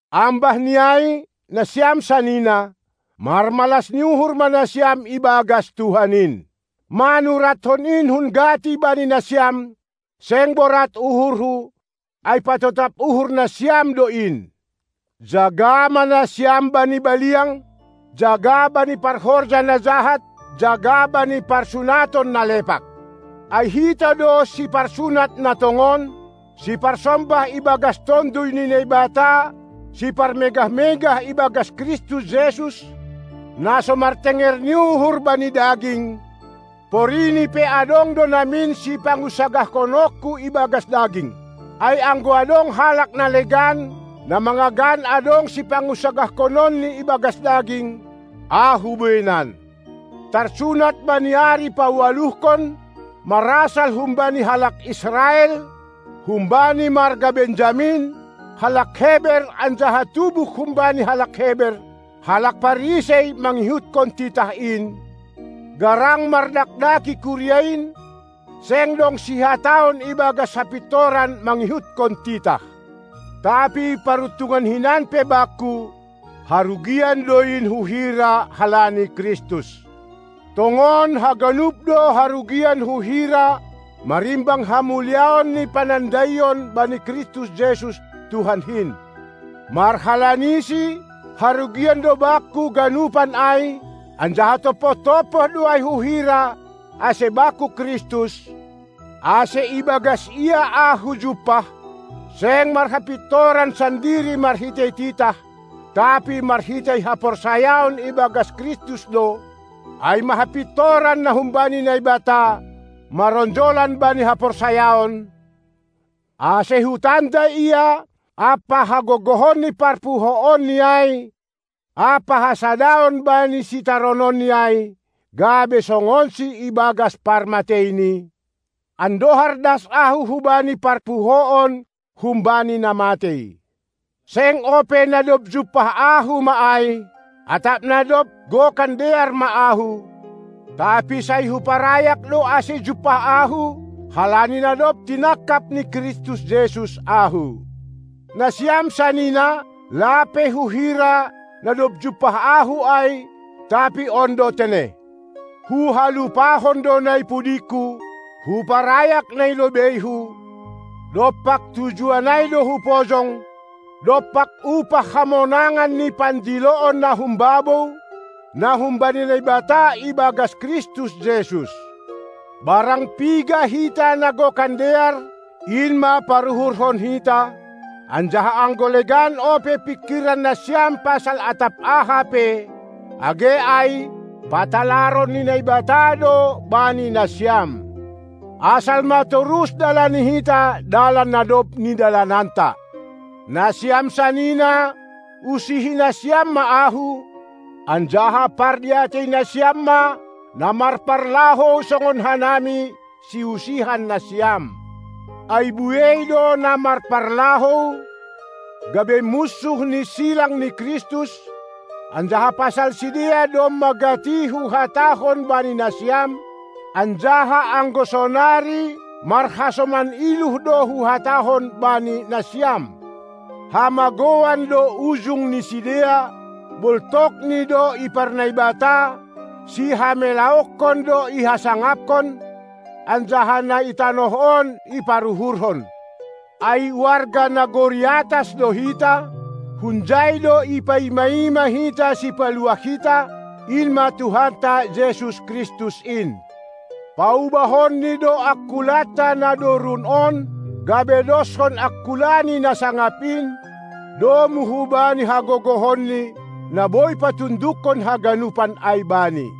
Ambah ni ai, nasiam sanina, marmalas ni uhur ma nasiam ibagas Tuhan in! Manurathon in hun gati bani nasiam, seng borat uhurhu, ai patotap uhur nasiam do in. Jaga ma nasiam bani baliang, jaga bani parhorja na jahat, jaga bani parsunaton na lepak! Ai hita do siparsunat na tongon, siparsombah ibagas Tonduy ni Naibata siparmegah-megah ibagas Kristus Jesus, na so martenger ni uhur bani daging, porini pe adong do namin sipangunsagahkononku ibagas daging. Ai anggo adong halak na legan, na mangagan adong sipangunsagahkononni ibagas daging, ahu bueinan: Tarsunat bani ari paualuhkon, marasal humbani halak Israel, humbani marga Benjamin, halak Heber anjaha tubuh humbani halak Heber, halak Parisei mangihutkon titah in, garang mardakdaki kuria in, seng dong sihataon ibagas hapintoran mangihutkon titah. Tapi paruntungan hinan pe bakku, harugian do in huhira halani Kristus. Tongon haganup do harugian huhira marimbang hamuliaon ni panandaion bani Kristus Jesus, Tuhankin. MarhalaniSi harugian do bakku ganupan ai, anjaha tompoh-tompoh do ai huhira, ase bakku Kristus, ase ibagas Ia ahu jumpah, seng marhapintoran sandiri marhitei titah, tapi marhitei haporsayaon ibagas Kristus do, ai ma hapintoran na humbani Naibata, maronjolan bani haporsayaon, ase hutanda Ia ampa hagogohon ni parpuhoonNi ai ampa hasadaon bani sitarononNi ai, gabe songonSi ibagas parmateiNi, andohar das ahu hubani parpuhoon humbani na matei. Seng ope, na dob jumpah ahu ma ai, atap na dob gokan dear ma ahu; tapi sai huparayak do ase jumpah ahu, halani na dob tinangkap ni Kristus Jesus ahu. Nasiam sanina, lape huhira, na dob jumpah ahu ai, tapi on do tene: Huhalupahon do na i pudingku, huparayak na i lobeihu, dompak tujuan ai do hupojong, dompak upah hamonangan ni pandiloon na humbabou, na humbani Naibata ibagas Kristus Jesus. Barang piga hita na gokan dear, in ma paruhurhon hita; anjaha anggo legan ope pingkiran nasiam pasal atap aha pe, age ai patalaron ni Naibata do bani nasiam. Asal ma torus dalani hita dalan na dob nidalananta. Nasiam sanina, usihi nasiam ma ahu, anjaha pardiatei nasiam ma na marparlahou songon hanami, siusihan nasiam. Ai buei do na marparlahou, gabe munsuh ni silang ni Kristus; anjaha pasal sidea domma gati huhatahon bani nasiam, anjaha anggo sonari marhasoman iluh do huhatahon bani nasiam. Hamagouan do ujung ni sidea, boltokni do iparnaibata, sihamelahononkon do ihasangapkon, anjaha na i tanoh on iparuhurhon. Ai warga nagori atas do hita, hunjai do ipaima-ima hita Sipaluah hita, in ma Tuhanta Jesus Kristus in. PaubahonNi do angkulanta na dorun on, gabe doshon angkulaNi na sangap in, domu hubani hagogohonNi, na boi patundukkon haganupan ai Bani.